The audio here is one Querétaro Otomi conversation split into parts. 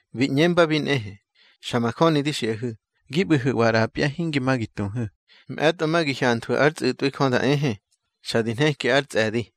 Bi ꞌñembabi nꞌehe: —Xa majöni di xiꞌahu̱, gi ꞌbu̱hu̱wa ꞌrapya, hingi ma gi tuhu̱, mꞌe̱tꞌo ma gi hyanthwu̱ ár tsꞌu̱tꞌwi Jö da ehe, xa di nheki ár tsꞌe̱di.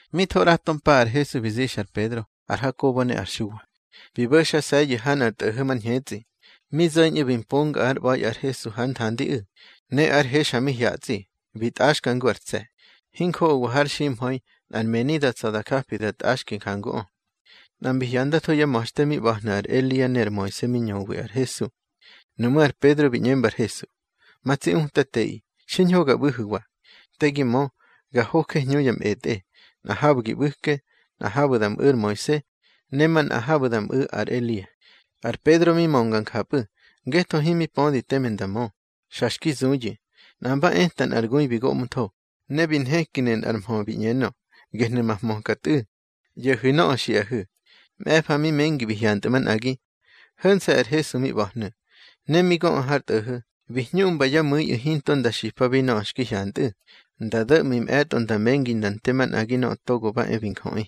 Mi tho ꞌrato mpa ar Hesu bi zixa ar Pedro, ar Hakobo ne ar Xuwa, bi bo̱xase̱yu̱ ha nꞌar tꞌo̱ho̱ mar ñhetsꞌi. Mi zo̱ñꞌu̱ bi mponga ár ꞌba̱i ar Hesu hár nthandiꞌu̱. Ne ár he xa mi hyatsꞌi, bi tꞌaxki ngu ar tse̱. Hinjoꞌowa har ximha̱i nꞌar meni da tsa̱ da japi da tꞌaxki njanguꞌö. Nꞌa mbi hyandatho yá ma̱xte mi ꞌba̱hnu̱ ar Elia ne ar Moise mi ñöwi ar Hesu. Nuꞌmú̱ ar Pedro bi ꞌñemba ar Hesu: —Ma tsi Utateꞌi, xiñho ga ꞌbu̱hu̱wa. Te gi mö, ga hoje hñu ya mꞌetꞌe, nꞌa habu̱ gi ꞌbu̱ke, nꞌa habu̱ da mꞌu̱ ar Moise, ne manꞌa habu̱ da mꞌu̱ ar Elia. Ar Pedro mi mönga njapꞌu̱, ngetho himi pödi teme nda mö, xa xki zuyu̱. Nꞌa mba eta nꞌar gui bi goꞌmtho, ne bi nhekinu̱ nꞌar mhö bi ꞌñenö: —Gehnu̱ ma hmöka Tꞌu̱. ꞌYo̱hu̱ nöꞌö xiꞌahu̱. Mꞌe̱fa mi mengi bi hyantꞌu̱ manꞌagi, ho̱nse̱ ar Hesu mi ꞌba̱hnu̱. Ne mi göꞌu̱ har tꞌo̱ho̱, bi hñuꞌmba yá mu̱iꞌu̱ hinto nda xipabi nöꞌö xki hyantꞌu̱, nda do̱ꞌmi mꞌe̱tꞌo nda mengi nda nte manꞌagi Nöꞌö Togo ba e bi Njöꞌi.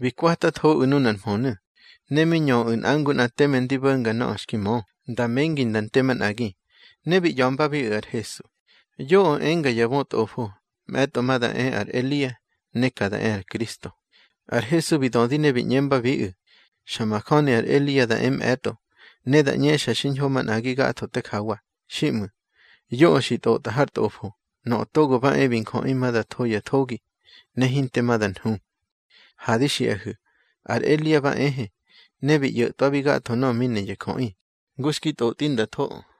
Bi kwatathoꞌu̱ nunar mhönu̱, ne mi ñöꞌu̱ nꞌa ngu nꞌa teme ndi bo̱nga nöꞌö xki mö, nda mengi nda nte manꞌagi. Ne bi ꞌya̱mbabiꞌu̱ ar Hesu: —Yoꞌö enga ya bötꞌofo, mꞌe̱tꞌo ma da e ar Elia, ne ka da e ar Kristo. Ar Hesu bi dödi ne bi ꞌñembabiꞌu̱: —Xa majöni ar Elia da e mꞌe̱tꞌo, ne da ꞌñexa xiñho manꞌagi gatho te jawa. Xiꞌmu̱, yoꞌö xi tꞌotꞌa har Tꞌofo, Nöꞌö Togo ba e bi Njöꞌi ma da tho ya thogi, ne hinte ma da nhu. Ha di xiꞌahu̱, ar Elia ba ehe, ne bi ꞌyo̱tꞌwabi gatho nöꞌö mi ne ya jöꞌi, ngu xki tꞌotꞌi nda thoꞌö.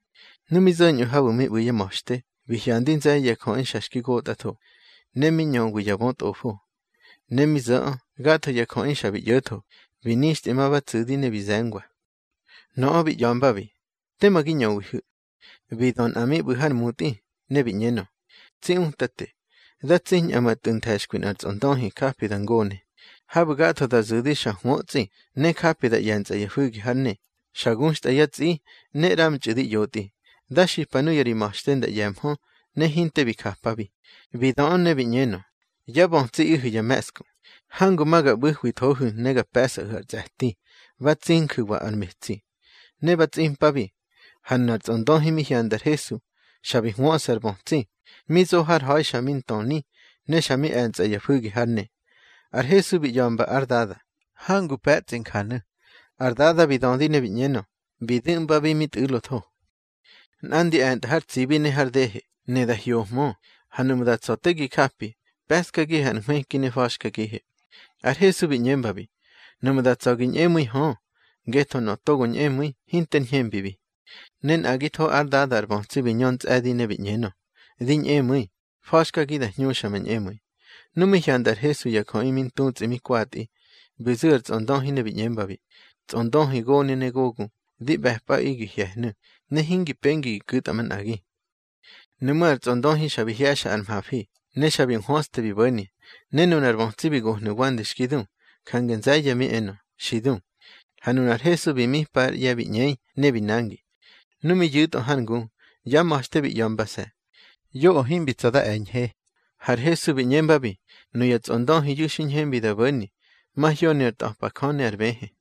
Nu mi zo̱ñꞌö habu̱ mi ꞌbu̱ yá ma̱xte, bi hyandi nze̱ye̱ ya jöꞌi xa xki gotꞌatho, ne mi ñöwi ya bötꞌofo. Ne mi zo̱ꞌö, gatho ya jöꞌi xa bi ꞌyo̱tho, bi nixtꞌi ma ba tsu̱di ne bi ze̱ngwa. Nöꞌö bi ꞌya̱mbabi: —Tema gi ñöwihu̱. Bi dö nꞌa mi ꞌbu̱ har mutꞌi, ne bi ꞌñenö: —Tsi Utate, da tsiñꞌa ma tꞌu̱ nthe̱xkwi nꞌar tsꞌondöhi japi da ngone. Habu̱ gatho da zu̱di xa hwötsꞌi, ne japi da ꞌye̱ntsꞌa ya fu̱gi hár ne, xa guxtꞌa yá tsꞌi, ne ꞌramtxꞌu̱ di ꞌyotꞌi. Da xipa nuya ri ma̱xte nda ꞌye̱mhö, ne hinte bi japabi. Bi döꞌö ne bi ꞌñenö: —Yá bötsiꞌihu̱ ya me̱ꞌsku. Hangu ma ga ꞌbu̱hwithohu̱ ne ga pe̱sꞌahu̱ ar tsꞌe̱ti. Ba tsinju̱wa ar metsi. Ne ba tsꞌimpabi. Ha nunar tsꞌondöhi mi hyanda ar Hesu, xa bi hwöꞌsa ar bötsi, mi zo har ha̱i xa mi ntöni, ne xa mi e̱ntsꞌa ya fu̱gi hár ne. Ar Hesu bi ꞌya̱mba ár dada: —Hangu pe̱tsꞌi njanu̱. Ar dada bi dödi ne bi ꞌñenö: —Bi du̱ꞌmbabi mi tꞌu̱lotho. Nꞌandi e̱ntꞌa har tsibi ne har dehe, ne da hyohmö. Ha nuꞌmu̱ da tsa̱ te gi japi, pe̱ꞌskagihe ar nhwëki ne fa̱xkagihe. Ar Hesu bi ꞌñembabi: —Nuꞌmu̱ da tsa̱ gi ñꞌemu̱i hö, ngetho nöꞌö togo ñꞌemu̱i, hinter ñhembibi. Ne nꞌagitho ár dada ar bötsi bi ñö ntsꞌe̱di ne bi ꞌñenö: —Di ñꞌemu̱i. Fa̱xkagi da hñuxa ma ñꞌemu̱i. Nu mi hyanda ar Hesu ya jöꞌi mi ntutsꞌi mi kwatꞌi, bi zu̱ ar tsꞌondöhi ne bi ꞌñembabi: —Tsꞌondöhi gone ne gogu, di ꞌbe̱pꞌaꞌi gi hye̱hnu̱, ne hingi pengi gi ku̱tꞌa manꞌagi. Nuꞌmú̱ ar tsꞌondöhi xa bi hye̱xa ar mhafi, ne xa bi nhwöste bi bo̱ni. Ne nunar bötsi bi gohnu̱ wande xki du, jange nze̱ye̱ mi enö: —Xi du. Ha nunar Hesu bi mipa ár ꞌye̱ bi ꞌñei, ne bi nangi. Nu mi yu̱tꞌö har ngu, yá ma̱xte bi ꞌya̱mbase̱: —Yoꞌö himbi tsa̱ da e̱ñhe. Har Hesu bi ꞌñembabi: —Nuya tsꞌondöhiyu̱ xi ñhembi da bo̱ni, mahyoni ar ntꞌa̱pa Jö ne ar bëhë.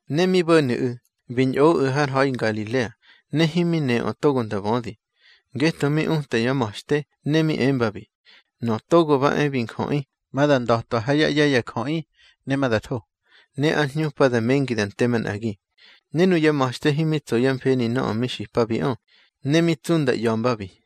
Ne mi bo̱nu̱ꞌu̱, bi ñꞌoꞌu̱ har ha̱i Ngalilea, ne himi neꞌö togo nda bödi. Ngetho mi uta yá ma̱xte, ne mi embabi: —Nöꞌö Togo ba e bi Njöꞌi ma da nda̱twa yá ꞌye̱ ya jöꞌi, ne ma da tho. Ne ár hñupa da mengi da nte manꞌagi. Ne nuyá ma̱xte himi tso yá mfeni nöꞌö mi xipabiꞌö, ne mi tsu nda ꞌya̱mbabi.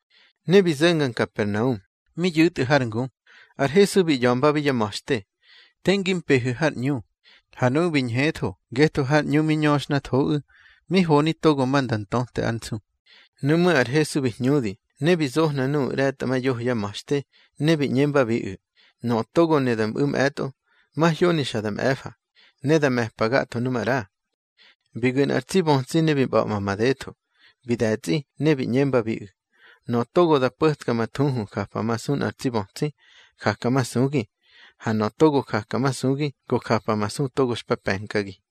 Ne bi zo̱nga Nkapernaum, mi yu̱tꞌu̱ har ngu, ar Hesu bi ꞌya̱mbabi yá ma̱xte: —Te ngi mpehu̱ har ꞌñu. Ha nuꞌu̱ bi ñhetho, ngetho har ꞌñu mi ñöxhnathoꞌu̱, mi honi togo ma nda ntöte ár nsu. Nuꞌmú̱ ar Hesu bi hñudi, ne bi zohna nuꞌu̱ ꞌre̱tꞌamayoho yá ma̱xte, ne bi ꞌñembabiꞌu̱: —Nöꞌö togo ne da mꞌu̱ mꞌe̱tꞌo, mahyoni xa da mꞌe̱fa, ne da me̱pa gatho nu maꞌra. Bi gu̱ nꞌar tsi bötsi ne bi ꞌba̱ꞌma madetho, bi de̱tsꞌi, ne bi ꞌñembabiꞌu̱: —Nöꞌö togo da po̱tka ma thuhu japamasu nꞌar tsi bötsi, jakamasugi. Ha nöꞌö togo jakamasugi, go japamasu togo xpa pe̱nkagi.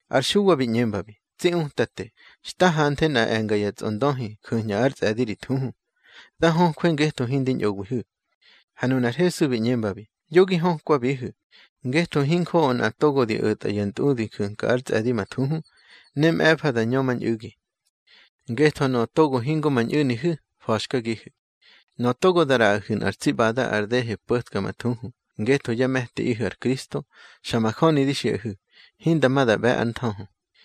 Ar Xuwa bi ꞌñembabi: —Tsi Utate, xta hanthe nꞌa e̱nga ya tsꞌondöhi ju̱ñꞌa ár tsꞌe̱di ri thuhu. Da höjwe ngetho hindi ñꞌowihu̱. Ha nunar Hesu bi ꞌñembabi: —Yo gi hökwabihu̱, ngetho hinjoꞌo nꞌa togo di o̱tꞌa ya ntꞌudi ju̱nka ár tsꞌe̱di ma thuhu, ne mꞌe̱fa da ñömañꞌu̱gi. Ngetho nöꞌö togo hingo ma ñꞌu̱nihu̱, fa̱xkagihu̱. Nöꞌö togo da ꞌraꞌahu̱ nꞌar tsi ꞌbada ar dehe po̱tka ma thuhu ngetho yá me̱tiꞌihu̱ ar Kristo, xa majöni di xiꞌahu̱, hinda ma da ꞌbe̱ ár nthöhö.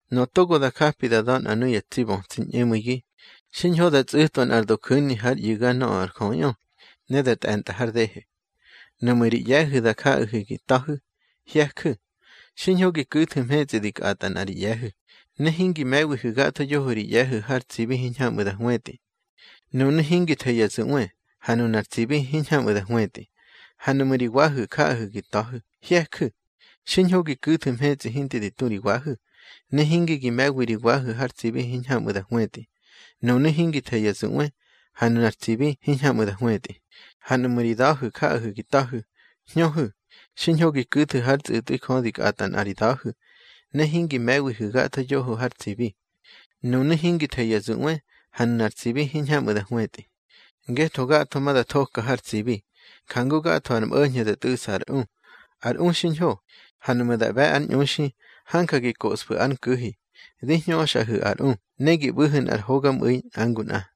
Nöꞌö togo da japi da da̱ nꞌa nuya tsi bötsi ñꞌemu̱igi, xiñho da tsꞌu̱twa nꞌar doju̱ni hár ꞌyu̱ga nöꞌö ar jöꞌiꞌö, ne da tꞌe̱ntꞌa har dehe. Nuꞌmu̱ ri ꞌye̱hu̱ da jaꞌahu̱ gi ta̱hu̱, hye̱ju̱. Xiñho gi ku̱thu̱ mhetsꞌi di kꞌatꞌa nꞌa ri ꞌye̱hu̱, ne hingi me̱wihu̱ gatho yoho ri ꞌye̱hu̱ har tsibi hiñhamꞌu̱ da hwetꞌi. Nunu̱ hingi the ya zuꞌwe, ha nunar tsibi hiñhamꞌu̱ da hwetꞌi. Ha nuꞌmu̱ ri wahu̱ jaꞌahu̱ gi ta̱hu̱, hye̱ju̱. Xiñho gi ku̱thu̱ mhetsꞌi hinte di tu ri wahu̱, ne hinge gi me̱wi ri wahu̱ har tsibi hiñhamꞌu̱ da hwetꞌi. Nunu̱ hingi the ya zuꞌwe, ha nunar tsibi hiñhamꞌu̱ da hwetꞌi. Ha nuꞌmu̱ ri da̱hu̱ jaꞌahu̱ gi ta̱hu̱, hñöhu̱. Xiñho gi ku̱thu̱ hár tsꞌu̱tꞌwi Jö di kꞌatꞌa nꞌa ri da̱hu̱, ne hingi me̱wihu̱ gatho yoho har tsibi. Nunu̱ hingi the ya zuꞌwe, ha nunar tsibi hiñhamꞌu̱ da hwetꞌi. Ngetho gatho ma da thoka har tsibi, jangu gatho ar mꞌo̱ñho̱ da tꞌu̱ꞌsa ar u. Ar u xiñho, ha nuꞌmu̱ da ꞌbe̱ ár ñꞌuxi, hanja gi koꞌsfu̱ ár nku̱hi. Di hñöxꞌahu̱ ar u, ne gi ꞌbu̱hu̱ nꞌar hogamꞌu̱i nꞌa ngu nꞌa.